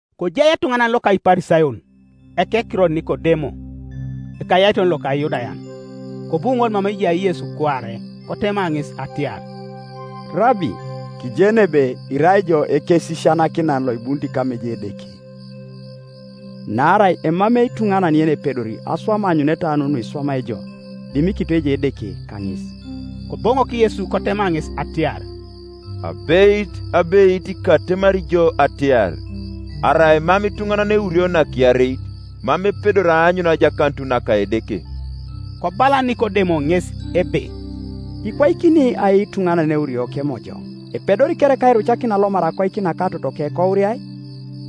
Kojai etuŋanan loka Iparisayon, ekekiror Nikodemo, ekayaiton loka Iyudayan. Kobu ŋol mama ejai Yesu kuare, kotema ŋes atiar, “Rabi, kijeni ebe irai ijo Ekesisianakinan loibunit kama ejai Edeke; naarai emamei ituŋanan yenepedori aswam aanyuneta nu nuiswamai ijo, dimikito ejai Edeke kaŋes.” Koboŋok Yesu kotema ŋes atiar, “Abeit, abeit, katemari jo atiar, Arai mam ituŋanan eurio nakiareit, mam epedori aanyun ajakanut naka Edeke.” Kobala Nikodemo ŋes ebe, “Ikwaikini ai ituŋanan eurio kemojoŋ? Epedori kereka airucakin alomar akoik naka totoke, kouriai?”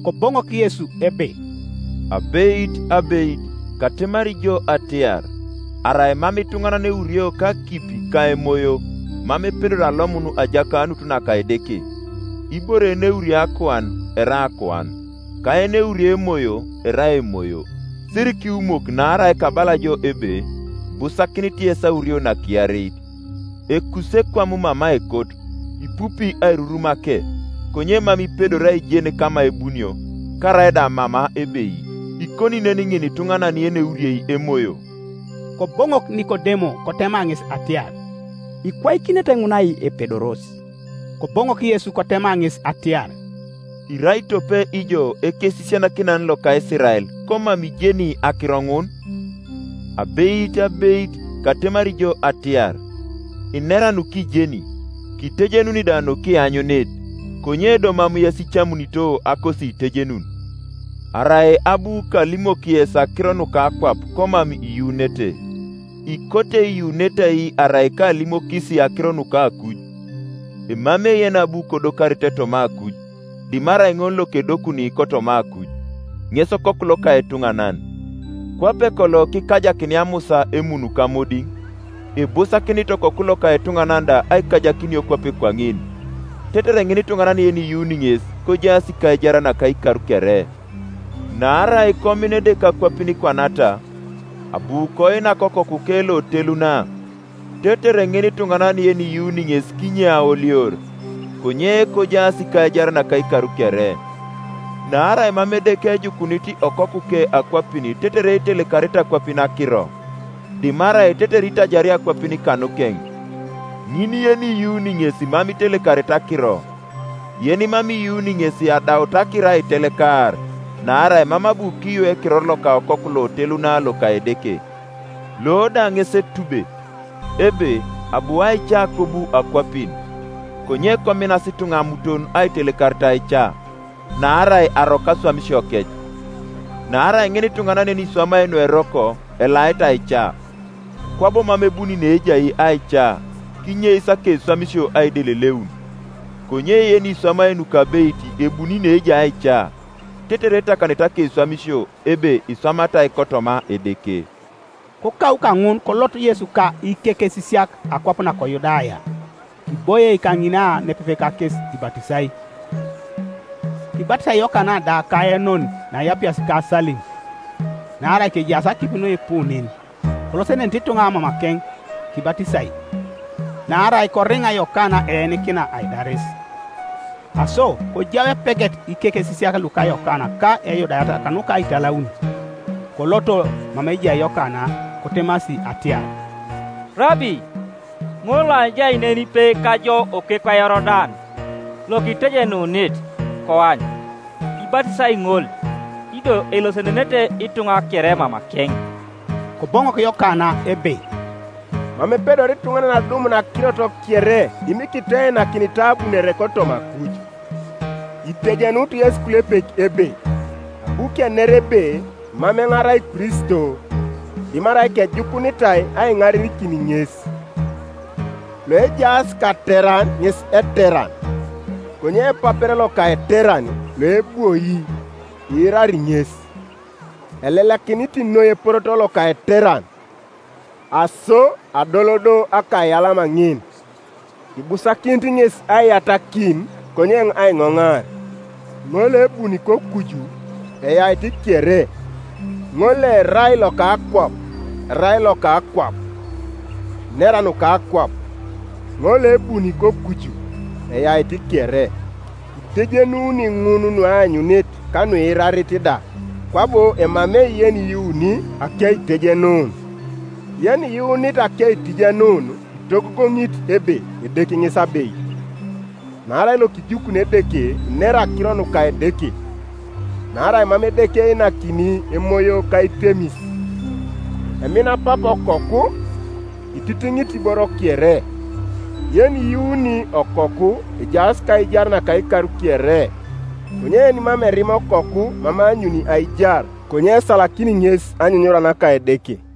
Koboŋok Yesu ebe, “Abeit, abeit, katemari jo atiar, Arai mam ituŋanan eurio kakipi ka Emoyo, mam epedori alomun ajakanut naka Edeke. Ibore yeneuriei akuan erai akuan; ka yeneuriei Emoyo erai emoyo, Sirikiwumok naarai kabala jo ebe, Ibusakinit yes aurio nakiareit. Ekusi ekwam mama ekot, ipupi airurumake; konye mam ipedori aijen kama kebunio, karaida mama ebei; ikoni nen ŋinituŋanan yeneuriei Emoyo.” Koboŋok Nikodemo kotema ŋes atiar, “Ikwaikinete ŋun ai epedoros?” Koboŋok Yesu kotema ŋes atiar, “Irai tope ijo ekesisianakinan loka Isirael, komam ijeni akiro ŋun? Abeit, abeit, katemari jo atiar, Kinera nukijeni, kitejenuni da nukianyunit; konye do mam yes icamunito akosiitejenun. Arai abu kalimok yes akiro nuka akwap komam iyuunete, ikote Iyuunete ai arai kaalimokis akiro nuka akuj? Emamei yenabu kodokarite toma akuj, dimarai ŋol lokedokuni kotoma akuj, ŋes Okoku loka etuŋanan. Kwape kolo kikajakinia Musa emun kamodiŋ, ibusakinit Okoku loka etuŋanan da aikajakinio kwape kwaŋin: tetere ŋinituŋanan yeniyuuni ŋes kojaas kaijar naka ikar kere.” Naarai komina Edeke akwapin kwanata, abu koinak Okokuke loteluna, tetere ŋinituŋanan yeniyuuni ŋes kinye aolior, konye kojaas kaijar naka ikar kere. Naarai mam Edeke ejukunit Okokuke akwapin tetere itelekarete akwapin akiro, dimarai tetere itajario akwapin kanukeŋ. Ŋin yeniyuuni ŋes mam itelekarete akiro; yenimam iyuuni ŋes adaut akiro aitelekar, naarai mam abu kiyuu ekiror loka Okoku loteluna loka Edeke. Lo da ŋes etube, ebe abu aica kobu akwapin, konye kominas ituŋa amuton aitelekarit aica, naarai aroko aswamisiokec. Naarai ŋinituŋanan yeniswamai nueroko elait aica, kwabo mam ebuni neejai aica, kinyeis akeswamisio aideleleun. Konye yeniswamai nukabeit ebuni neejai aica, tetere etakanete akeswamisio, ebe iswamatai kotoma Edeke. Kokau kaŋun kolot Yesu ka ikekesisiak akwap nako Yudaya; kiboie kaŋina nepepe kakes ibatisai. Kibatisai Yokana da kAenon naeapias ka Salim, naarai kejaas akipi nuipu nen; kolosenenete ituŋa mamakeŋ kibatisai. Naarai koriŋa Yokana eenikina aidaris. Aso kojau epeget ikekesisiak luka Yokana ka Eyudayat kanuka aitalaun. Koloto mama ejai Yokana, kotemasi atiar, “Rabi, ŋol loajai nenipe kajo okekwa Yorodan, lokitejenunit, koany, ibatisai ŋol, ido elosenenete ituŋa kere mamakeŋ.” Koboŋok Yokana ebe, “Mam epedori ituŋanan adumun akirot kere dimikito einakinitai abunore kotoma akuj. Itejenut yesi ikulepek ebe, abu kener ebe, Mam eoŋ arai Kristo, dimarai kejukunitai aiŋarenikin ŋes. Loejaas kateran ŋes eteran; konye epapero loka eteran, loebwoi iirari ŋes, elelakinit noi eporoto loka eteran; aso adol do akaiyalama ŋin. Ibusakinit ŋes aiyatakin, konye eoŋ aiŋoŋar.” Ŋol loebuni kokuju eyait kere; ŋol loerai loka akwap erai loka akwap, inera nuka akwap; ŋol loebuni kokuju eyait kere. Itejenuni ŋun nueanyunit ka nuiirarit da, kwabo emamei yeniyuuni akeitejenun. Yeniyuunit akeitejenun itogogoŋit ebe Edeke ŋes abeit. Naarai lokijukuni Edeke inera akiro nuka Edeke: naarai mam Edeke einakini Emoyo kaitemis. Emina Papa Okoku, ititiŋit iboro kere. Yeniyuuni Okoku ejaas kaijar naka ikar kere; konye yenimam erima Okoku mam eanyuni aijar, konye esalakini ŋes anyunyura naka Edeke.